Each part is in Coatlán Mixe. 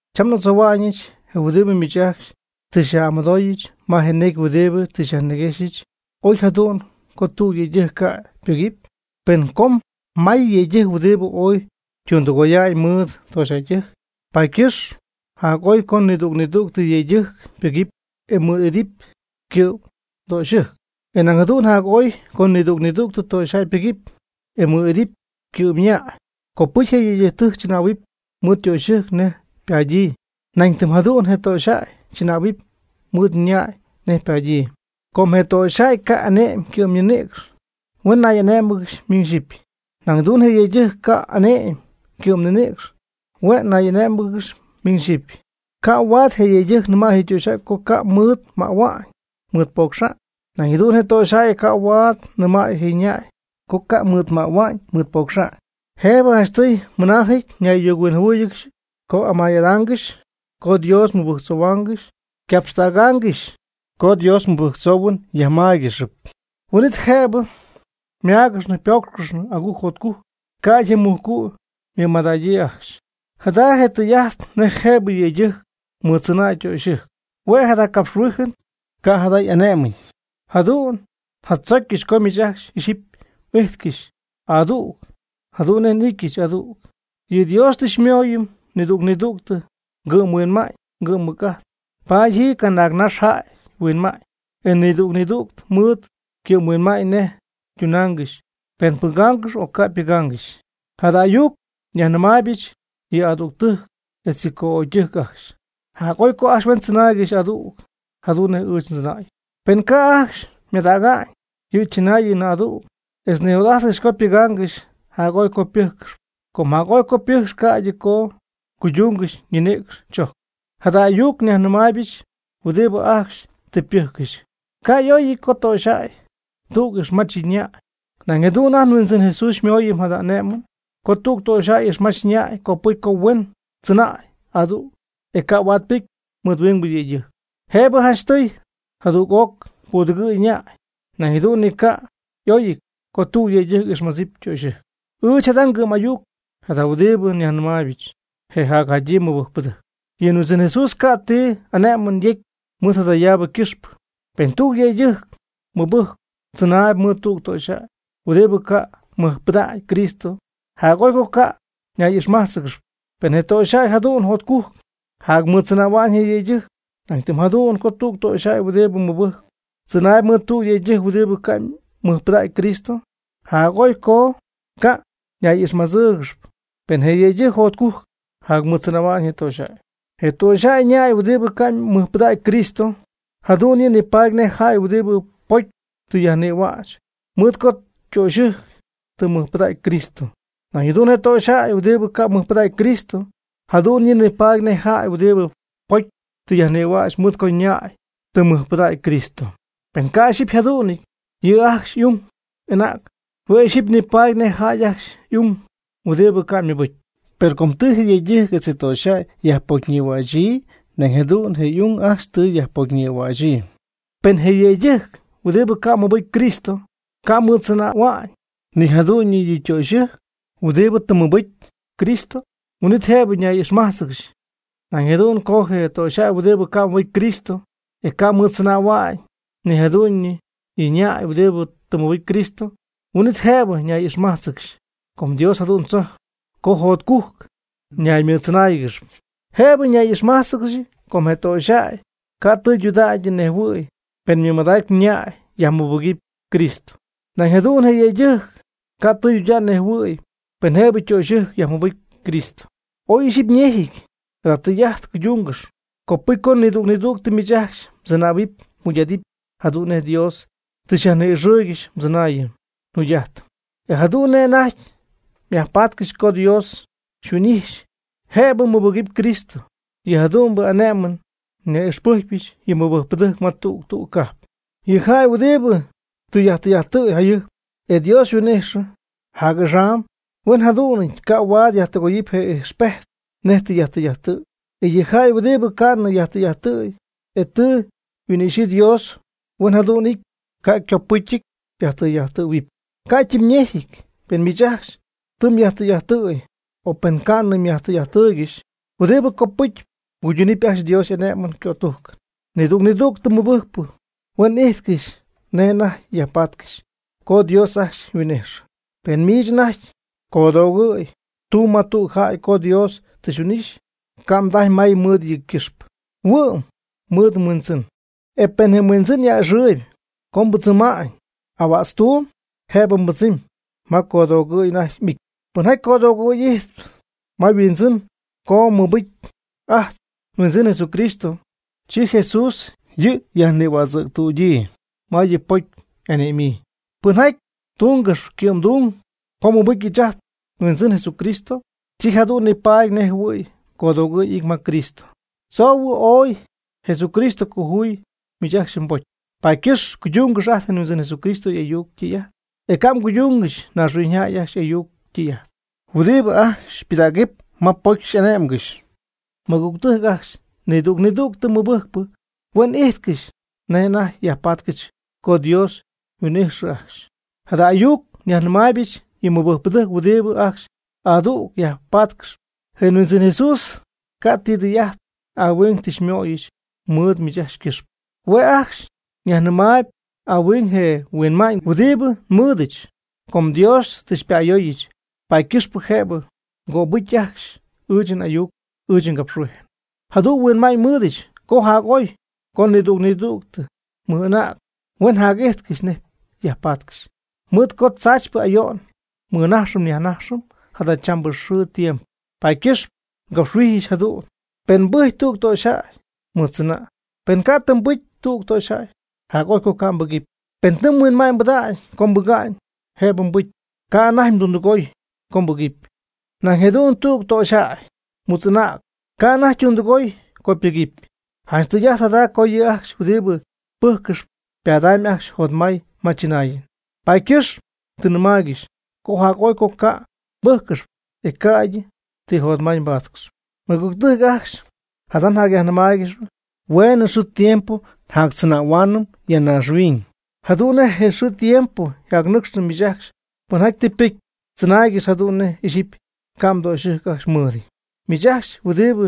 Cham n'adzohua'ñɨch je huɨdibɨ miich ajcxy tɨ xyaj'amɨdoobɨch ma je necy huɨdibɨ tɨ xyajniguéjxcɨxyɨch. Oy jadu'n co tüg yëydɨjc ca' ypɨgɨpy. Per com may yëydɨjc huɨdibɨ ooy ytundɨgoya'ñ mɨɨd töxyjäydijc, paady ycɨxp jac'oy co nidüg nidüg yëydɨjc pɨgɨpy e mɨɨd'idɨpy ycɨ'mdöxyɨjc. E nañ jadu'n jac'oy co nidüg nidüg töxyjäy ypɨgɨpy, e mɨɨd idɨpy ycɨ'm ñäy. Copɨcy je yëydɨjc chɨnähuɨpy mɨɨd ytöxyɨjc nej ypadyii, nan tɨm jadu'n je töxyjäy chɨnähuɨpy mɨɨd ñäy nej ypadyii. Com je töxyjäy ca' ane'my ycɨ'mninïcx, hue' ñay'ané'mɨgɨxy miñ xyɨpy. Nañ jadu'n je yëydɨjc ca' ane'my ycɨ'mninïcx, hue' ñay'ané'mɨgɨxy ymiñ xyɨpy. Ca' huaad je yëydɨjc nɨmay je töxyjäy co ca' mɨɨd mähua'ñ mɨɨd poocxa'ñ. Nañ jadu'n je töxyjäy ca' huaad nɨmay je ñäy co ca' mɨɨd mähua'ñ mɨɨd poocxa'ñ. Jëbɨ janchtɨy mɨnaajɨty ñay'ayuc-huinjɨhuɨɨygɨxy co amay'adaangɨxy co Dios mɨbɨjctzohuaangɨxy ycapxtägaangɨxy. Co Dios mɨbɨjctzoohuɨn myajmáygɨxɨpy, huin'it jëbɨ máagɨxnɨ pócxcɨxnɨ agujc jotcujc, ca'ydɨ je mujcu' mɨmadägyii ajcxy. Jada je' tɨy'ajt nej jëbɨ yëydɨjc mɨɨddzɨnäy ytöxyɨjc, hue' jada capxhuijɨn, ca' jada y'ané'mɨnɨty. Jadu'n njadzocyɨch co miich ajcxy ixyipy m'ijtcɨxy adüg jadu'n nej n'ityɨch adüg. Per Dios tɨ xymooyɨm nidüg nidüg ngɨ'mhuinma'ñ ngɨ'mmɨc'ajt. Paady ji canaagnax jäy yhuinma'ñ, e nidüg nidüg mɨɨd ycɨ'mhuinma'ñ nej ytunaangɨxy, pen pɨgaangɨxp o ca' ypɨgaangɨxy. Jada ayuc nyajnɨmaaybɨch yɨ adügtɨjc etz yɨ co'ögytɨjc ajcxy. Jac'oy co ajcxy huen tzɨnaaygɨxy adüg, jadu'n nej ɨɨch ndzɨnäyɨch. Pen ca' ajcxy mɨmadäga'ñ yɨ chɨnaayɨn adüg, etz nijot'ajtcɨxy co ypɨgaangɨxy, jac'oy co ypɨ́jcɨxɨpy. Com jac'oy co ypɨ́jcɨxɨpy ca'ydɨ co cuydúngɨxɨpy ninïcx chojcɨn. Jada ayuc nyajnɨmaaybɨch huɨdibɨ ajcxy tɨ ypɨjccɨxy. Ca' y'oyɨty co töxyjäy tüg ixmach yɨ' ñäy. Nañ jadu'n ajt nHuindzɨn Jesús xymooyɨm jada ane'mɨn. Co tüg töxyjäy ixmach ñäy, copɨcy co huen tzɨnäy adüg, e ca' huaad ypɨcy mɨɨd huingbɨ yëydɨjc. Jëbɨ janchtɨy jadüg'oc pudɨgɨ̈y ñäy. Nañ jadu'n ni ca' y'oyɨty co tüg yëydɨjc ixmadzip ytöxyɨjc. Ɨɨch jada ngɨ'm'ayuc jada huɨdibɨ nyajnɨmaaybɨch je jacjadyii mɨbɨjcpɨdɨjc. Yɨ Huindzɨn Jesús ca' ti ane'mɨn yecy mɨɨd jadayaabɨ ycɨxpɨ. Pen tüg yëydɨjc mɨbɨjcp tzɨnay mɨɨd tüg töxyjäy huɨdibɨ ca' mɨjpɨdägy Cristo, jac'oy co ca' ñay'ixmájtzɨgɨxɨpy, pen je töxyjäy jadu'n jotcujc jacmɨɨddzɨnähua'ñ je yëydɨjc. Nañ tɨm jadu'n co tüg töxyjäy huɨdibɨ mɨbɨjcp tzɨnay mɨɨd tüg yëydɨjc huɨdibɨ ca' mɨjpɨdägy Cristo, jac'oy co ca' ñay'ixmájtzɨgɨxɨpy pen je yëydɨjc jotcujc jacmɨɨddzɨnähua'ñ je töxyjäy. Je töxyjäy ñäy huɨdibɨ ca' mɨjpɨdägy Cristo, jadu'n yɨ' nipaady nej jäy huɨdibɨ ypocy tɨ yajnïhuäch mɨɨd co ytöxyɨjc tɨ mɨjpɨdägy Cristo. Nañ jadu'n je töxyjäy huɨdibɨ ca' mɨjpɨdägy Cristo, jadu'n yɨ' nipaady nej jäy huɨdibɨ ypocy tɨ yajnïhuäch mɨɨd co ñäy tɨ mɨjpɨdägy Cristo. Pen ca' ixyipy yjadu'nɨty, yɨ' ajcxy y'ung y'anäg, hue' ixyipy nipaady nej jäy ajcxy y'ung huɨdibɨ ca' mɨbɨcy. Per com tɨ je yëydɨjc etz je töxyjäy yajpocyñïhuächyii, nañ jadu'n je y'ung ajcxy tɨ yajpocyñïhuächyii. Per pen je yëydɨjc huɨdibɨ ca' mɨbɨcy Cristo ca' mɨɨddzɨnähua'ñ ni jadu'ñyɨ yɨ' ytöxyɨjc huɨdibɨ tɨ mɨbɨcy Cristo, huin'it jëbɨ ñay'ixmájtzɨgɨxy. Nañ jadu'n co je töxyjäy huɨdibɨ ca' mɨbɨcy Cristo, e ca' mɨɨddzɨnähua'ñ ni jadu'ñyɨ yɨ' ñäy huɨdibɨ tɨ mɨbɨcy Cristo, huin'it jëbɨ ñay'ixmajtzɨgɨxy. Com Dios jadu'n tzocy co jotcujc ñaymɨɨddzɨnáayɨgɨxɨpy. Jëbɨ ñay'ixmájtzɨgɨxy com je töxyjäy ca' tɨydudägy ñejhuɨ̈y pen mɨmadacy yñäy yajmɨbɨgɨpy Cristo. Nañ jadu'n je yëydɨjc ca' tɨydudägy ñejhuïy pen jëbɨ ytöxyɨjc yajmɨbɨgɨpy Cristo. Oy ixyipy ñejɨty jada tɨy'ajt cuydungɨxy. Copɨcy co nidüg nidüg miich ajcxy mdzɨnähuɨpy mjugy'adɨpy jadu'n nej Dios tɨ xyajni'ixɨɨygɨxy mdzɨnaayɨn mjugy'ajtɨn, e jadu'n nej anajty myajpatcɨxy co Dios xyhuin'ixy jëbɨ mmɨbɨgɨpy Cristo. Yɨ jadu'mbɨ ane'mɨn nyaj'ixpɨjcpyɨch yɨ mɨbɨjcpɨdɨjc ma tüg tüg cajp. Yɨ jäy huɨdibɨ tɨ yajtɨy'ajttɨ̈y jayɨjp, e Dios yhuin'ixyii jac'axam, huen jadu'nɨty, ca' huaad yajtɨgoy je ijxpejt nej tɨ yajtɨy'ajttɨ̈y. E yɨ jäy huɨdibɨ ca'nɨ yajtɨy'ajttɨ̈y e tɨ yhuin'ixyii Dios, huen jadu'n y'ity, ca' ycopɨcyɨty yajtɨy'ajttɨ̈huɨpy. Ca' ytimyñejɨty pen miich ajcxy tɨ myajtɨy'ajttɨ̈y, o pen ca'nɨ myajtɨy'ajttɨɨygɨxy. Huɨdibɨ copɨcyɨp, mguyduunɨp ajcxy Dios y'ane'mɨn ycötujcɨn. Nidüg nidüg mɨbɨjcpɨ huen ijtcɨxy nej anajty yajpatcɨxy co Dios ajcxy yhuin'ijxyɨ. Pen miich anajty codoogɨ̈y tumb ma tüg jäy co Dios tɨ xyhuin'ixy, ca' mdajy may mɨɨd yɨ' ycɨxpɨ, huɨ'm mɨɨd mhuindzɨn. E pen mhuindzɨn a'ɨxɨɨyb co mbɨdzɨma'ñ ahuätztuum, jëbɨ mbɨdzɨmy ma codoogɨ̈y anajty m'ity. Pɨnjaty codoogɨ̈y ijtp ma yhuindzɨn co mɨbɨcy ajt nHuindzɨn Jesucristo, chi Jesús yɨ' yajnïhuädzɨ̈ctüdyii ma yɨ pocy y'ane'myii. Pɨnjaty tungɨxp ycɨ'mdung, co mɨbɨcy ɨɨch ajt nHuindzɨn Jesucristo, chi jadu'n nipaady nej jɨhuɨ̈y codoogɨ̈y y'ity ma Cristo. Tzoohuɨ ooy Jesucristo xycojuuyɨ miich ajcxy mbocy, paady ycɨxpɨ cuydungɨx ajt nHuindzɨn Jesucristo y'ayuc ytɨy'ajt. E ca' mguydungɨxy naaxhuiñyjäy ajcxy y'ayuc ytɨy'ajt huɨdibɨ ajcxy xypɨdägɨp ma pocy xy'ane'mgɨxy. Mɨgügtɨjc ajcxy, nidüg nidüg mɨbɨjcpɨ, huen ijtcɨxy nej anajty yajpatcɨxy co Dios yhuin'ijxɨ ajcxy. Jada ayuc nyajnɨmaaybɨch yɨ mɨbɨjcpɨdɨjc huɨdibɨ ajcxy adüg yajpatcɨxp. Je Huindzɨn Jesús ca' ti tɨy'ajt ahuing tɨ xymöyɨch mɨɨd miich ajcxy ycɨxpɨ. Hue' ajcxy nyajnɨmaayb ahuing je huinma'ñ huɨdibɨ nmɨɨdɨch. Com Dios tɨ xypa'ayooyɨch, paady ycɨxpɨ jëbɨ mgöbɨgɨpy ajcxy ɨɨch n'ayuc ɨɨch ngapxhuijɨn. Jadu'n huinma'ñ nmɨɨdɨdyɨch co jac'oy co nidüg nidüg mɨj'anäg huen jac'ijtcɨxy nej yajpatcɨxy. Mɨɨd co tzaachypɨ ayo'n nmɨnajxɨm nyajnajxɨm jadachambɨ xɨɨ tiempo, paady ycɨxpɨ ngapxhuijyɨch jadu'n. Pen mbɨjcyp tüg töxyjäy, mɨɨddzɨna'. Pen ca' tɨ pɨcy tüg töxyjäy, jac'oy co ca' mbɨgɨpy. Pen tɨ mhuinma'ñ mbɨdägy co mbɨga'ñ, jëbɨ mbɨcy, ca' anajty mdundɨgoy co mbɨgɨpy. Nañ jadu'n tüg töxyjay mutz'anägnɨp ca' anajty ytundɨgoy co ypɨgɨpy. Janch tɨy'ajt jada co yɨ' ajcxy huɨdibɨ pɨjccɨxp ypadamyb ajcxy jotmay ma chɨnaayɨn. Paady ycɨxp tɨ nnɨmaaygɨxy co jac'oy co ca' mbɨ́jccɨxɨpy, e ca'ydɨ ti jotmay mbáatcɨxɨpy. Mɨgügtɨjc ajcxy, jada njacyajnɨmaaygɨxpy. Hueenɨ xɨɨ tiempo njactzɨnähuaanɨm ya naaxhuiñ. Jadu'n nej je xɨɨ je tiempo yjacnɨcxnɨ miich ajcxy pɨnjaty tɨ ypɨcy, tzɨnaaygɨx jadu'n nej ixyipy ca' mdöxɨjc ajcxy mɨɨdɨty. Miich ajcxy huɨdibɨ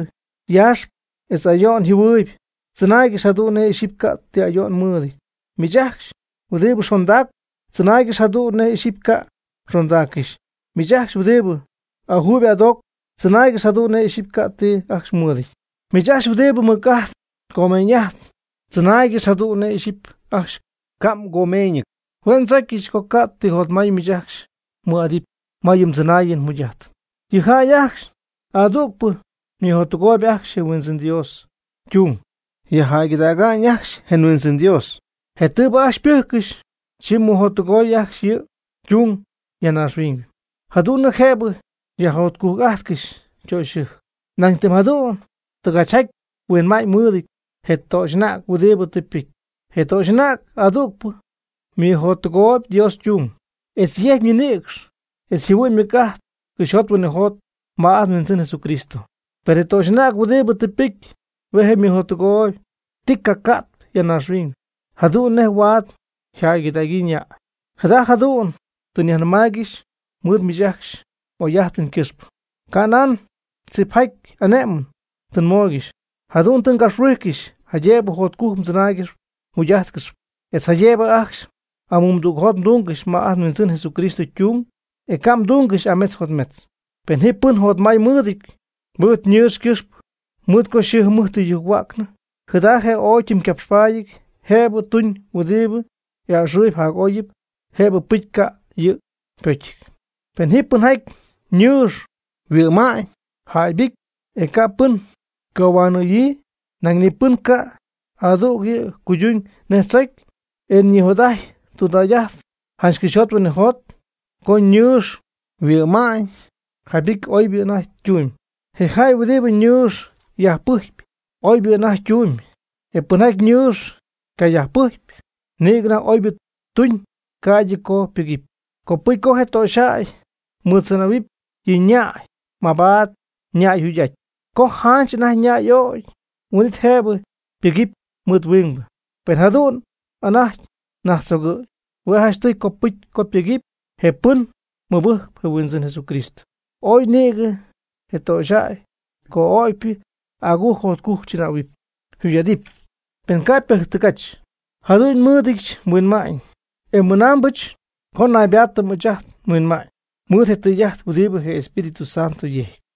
yaaxp etz ayo'n jɨhuɨɨyb, tzɨnaaygɨx jadu'n nej ixyipy ca' ti ayo'n mɨɨdɨty. Miich ajcxy huɨdibɨ xondacp, tzɨnaaygɨx jadu'n nej ixyipy ca' mxondaaccɨxy. Miich ajcxy huɨdibɨ ajuuyb adoocp tzɨnaaygɨx jadu'n nej ixyipy ca' ti ajcxy mɨɨdɨty. Miich ajcxy huɨdibɨ mɨc'ajt comeeñ'ajtp, tzɨnaaygɨx jadu'n nej ixyipy ajcxy ca' ti mgomeeñɨty. Hue' ndzocyɨch co ca' ti jotmay miich ajcxy mmɨɨd'adɨpy ma yɨ mdzɨnaayɨn mjugy'ajtɨn. Yɨ jäy ajcxy adügpɨ ymɨjottɨgooyb ajcxy je Huindzɨn Dios ytung, yajjäygɨdäga'ñ ajcxy je Huindzɨn Dios. Je tɨɨbɨ ajcxy ypɨjccɨxy, chi ymɨjottɨgooyb ajcxy yɨ' ytung ya naaxhuiñ, jadu'n nej jëbɨ yajjotcujc'ajtcɨxy ytöxyɨjc. Nañ tɨm jadu'n tɨgachjaty yhuinma'ñ mɨɨdɨty je töxy'anäg huɨdibɨ tɨ ypɨcy. Je töxy'anäg adügpɨ ymɨjottɨgooyb Dios ytung, etz yecy ñinïcx etz yjɨhuɨ'ñ ymɨc'ajt cɨxyjot huinɨjot ma ajt nHuindzɨn Jesucristo. Per je töxy'anäg huɨdibɨ tɨ ypɨcy, hue' je' ymɨjottɨgooyb ti ga ti ya naaxhuiñ, jadu'n nej huaad jäygɨdägyii ñäy. Jada jadu'n tɨ nyajnɨmaaygɨxy mɨɨd miich ajcxy m'oy'ajtɨn ycɨxpɨ. Ca' nan tzipjaty ane'mɨn tɨ nmooygɨxy. Jadu'n tɨ ngapxhuijcɨxy jaydëbɨ jotcujc mdzɨnaaygɨxy mjugy'ajtcɨxy, etz jaydëbɨ ajcxy amumdügjot mdungɨxy ma ajt nHuindzɨn Jesucristo ytung, e ca' mdungɨxy ametz jotmetz. Pen ji pɨn jotmay mɨɨdɨty mɨɨd ñɨɨx ycɨxpɨ, mɨɨd co yxɨɨ yjɨmɨjt tɨ yujc-huäcnɨ, jada je' ooy ytimycapxpaadyɨty, jëbɨ tuñ huɨdibɨ y'a'ɨxɨɨyb jac'oyɨp, jëbɨ ypɨcy, ca' yɨ' ypocyɨty. Pen ji pɨnjaty ñɨɨx yhuɨ'ma'ñ jaybɨcy, e ca' pɨn ycohuanɨ̈yii, nañ ni pɨn yca'adugyii co tuñ nej tzocyɨn, e ñijot'ajtyp tudägy'ajt janch cɨxyjot huinɨjot co yñɨɨx yhuɨ'ma'ñ jaybɨcy, oybɨ anajty ytumyb. Je jäy huɨdibɨ yñɨɨx yajpɨjcp, oybɨ anajty ytumyb, e pɨnjäy yñɨɨx cayajpɨjcp, nïgɨ anajty oybɨ tuñ ca'ydɨ co ypɨgɨpy. Copɨcy co je töxyjäy mɨɨddzɨnähuɨpy yɨ' ñäy mabaad yñäy yjugy'aty. Co janch anajty yñäy y'ögy, huin'it jëbɨ ypɨgɨpy mɨɨd huingbɨ, pen jadu'n anajty najtztzogɨ̈y. Hue' janchtɨy copɨcy co pɨgɨpy je pɨn mɨbɨjcp je Huindzɨn Jesucristo. Ooy nïgɨ je töxyjäy co'ögypɨ agujc jotcujc chɨnähuɨpy yjugy'adɨpy pen ca' ypɨjctɨgach, jadu'n nmɨɨdɨdyɨch nhuinma'ñ, e nmɨnaambɨch co naybaatɨp ɨɨch nhuinma'ñ mɨɨd je tɨy'ajt huɨdibɨ je Espíritu Santo yejcp.